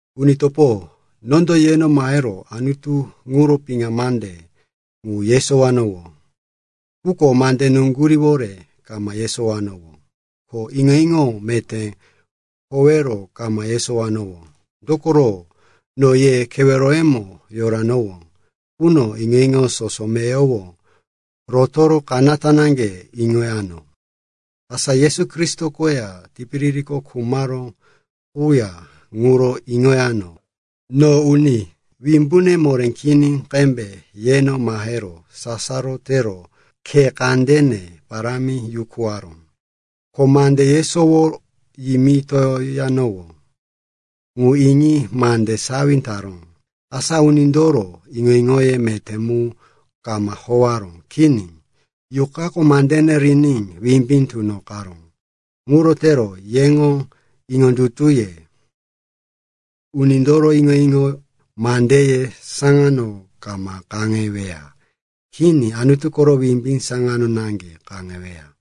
Uni topo, nondo yeno mahero Anutu ŋuro piŋa mande ŋu yesowanowó. Quko mande nuŋguríwore kama yesowanowó, ko iŋo-iŋo meté horéwore kama yesowanowó. Dokoro no ye keweroyemo yoranowó quno iŋo-iŋo soso meyowo rotoro kanata naŋge iŋoyano, asa Yesu Kristo koya tipiririko khumaró quya ŋuro iŋoyano. No uni wimbune moré kini qembe yeno mahero sasaro tero khe kandene parámi yukuwaró. Ko mande yesowo yimitoyanowó ŋu iŋi mande sawi taró, asa unindoro iŋo-iŋoye meté mu kama howaró. Kini, Yuqako mandene riní wimbí tunoqaró. Ŋuro tero yeŋo iŋondutuye unindoro iŋo-iŋo mandeye saŋano kama kaŋeweya. Kini, Anutu koro wimbí saŋano naŋge kaŋeweya.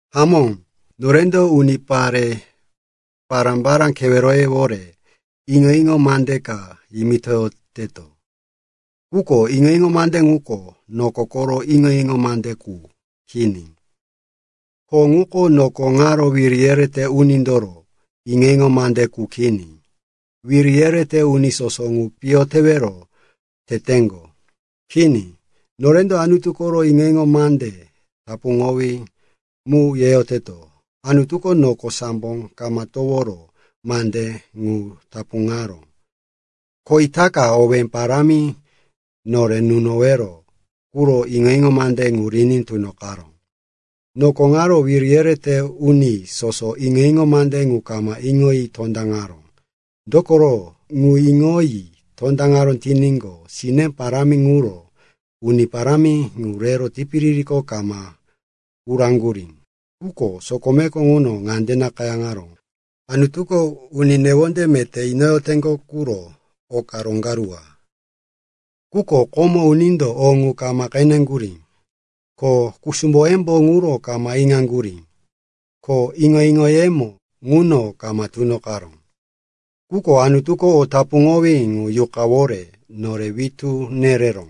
Hamó, norendo unipare pará-pará keweroyewore iŋo-iŋo mande ka yimitoyoteto. Quko iŋo-iŋo mande ŋuko noko koro iŋo-iŋo mande qu kini. Ko ŋuko noko ŋaro wiri yerete unindoro iŋo-iŋo mande qu kini. Wiri yerete uni soso ŋu piyo tewero teteŋgo. Kini. Norendo Anutu koro iŋo-iŋo mande tapuŋowí mu yeyoteto. Anutuko noko sambo kama toworo mande ŋu tapuŋaró. Ko itaka, owé parámi nore nunowero quro, iŋo-iŋo mande ŋu riní tunoqaró. Noko ŋaro wiri yerete uni soso iŋo-iŋo mande ŋu kama iŋoyi tondaŋaró. Dokoro, ŋu iŋoyi tondaŋaró tiníqo, sine parámi ŋuro Uni Parámi ŋu rero tipiririko kama uraŋgurí. Quko sokomeko ŋuno ŋande nakayáŋaró, “Anutuko uni newonde meté inoyoteŋgo ŋuro oka roŋgaruwa, quko komo unindo o ŋu kama qeneŋgurí, ko kusumboyembo ŋuro kama iŋaŋgurí, ko iŋo-iŋoyemo ŋuno kama tunoqaró.” Quko Anutuko o tapuŋowí ŋu Yuqayówore nore witú nereró.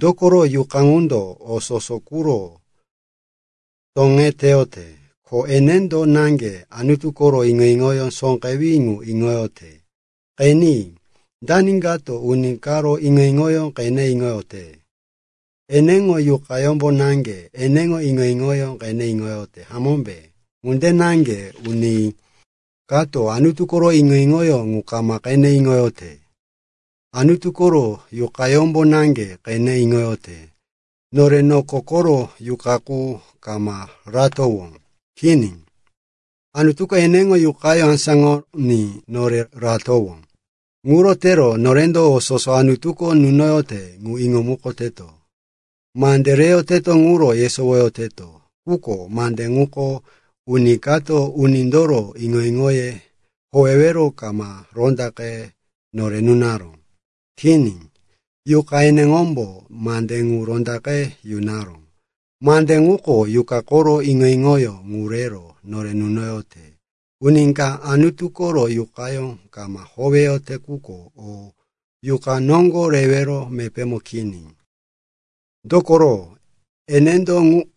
Dokoro Yuqa ŋundo o soso quro toŋeteyote, ko enendo naŋge Anutu koro iŋo-iŋo sóqewí ŋu iŋoyote. Qeni, dani kato uni karo iŋo-iŋoyó qene iŋote? Eneŋo yuqayómbo naŋge eneŋo iŋo-iŋoyó qene iŋote, hamómbe? Ŋunde naŋge uni kato Anutu koro iŋo-iŋoyó ŋu kama qene iŋote, Anutu koro Yuqayómbo naŋge qene iŋote. Nore noko koro yuqa qu kama ratowó. Kini. Anutuko eneŋo Yuqayó asáŋoní nore ratowó. Ŋuro tero norendo o soso Anutuko nunoyote ŋu iŋomukoteto. Mande reyoteto ŋuro yesowoyoteto, quko mande ŋuko uni kato unindoro iŋo-iŋoye howero kama rondaqe nore nunaró. Kini, Yuqa eneŋombo mande ŋu rondaqe yunaró. Mande ŋuko Yuqa koro iŋo-iŋoyó ŋu rero nore nunoyote. Uni ka Anutu koro Yuqayó kama howeyote quko o Yuqa noŋgo rewero mepémo kini. Dokoro enendo,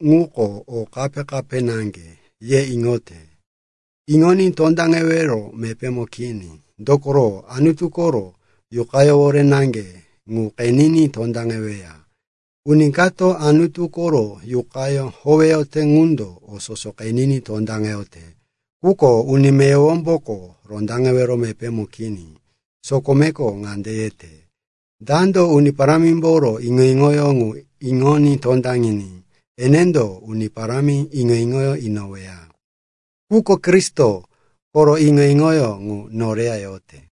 ŋuko o kape-kape naŋge, ye iŋote. Iŋoní tondaŋewero mepémo kini, dokoro Anutu koro Yuqayówore naŋge ŋu qeniní tondaŋeweya. Uni kato Anutu koro Yuqayó howeyote qundo o soso qeniní tondaŋeyote. Quko uni meyowomboko rondaŋewero mepémo kini. Sokomeko ŋande yete, “Dando Uni Parámimboro iŋo-iŋoyó ŋu iŋoní tondaŋiní enendo Uni Parámi iŋo-iŋo inoweya?” Quko Kristo koro iŋo-iŋoyó ŋu noreya yote.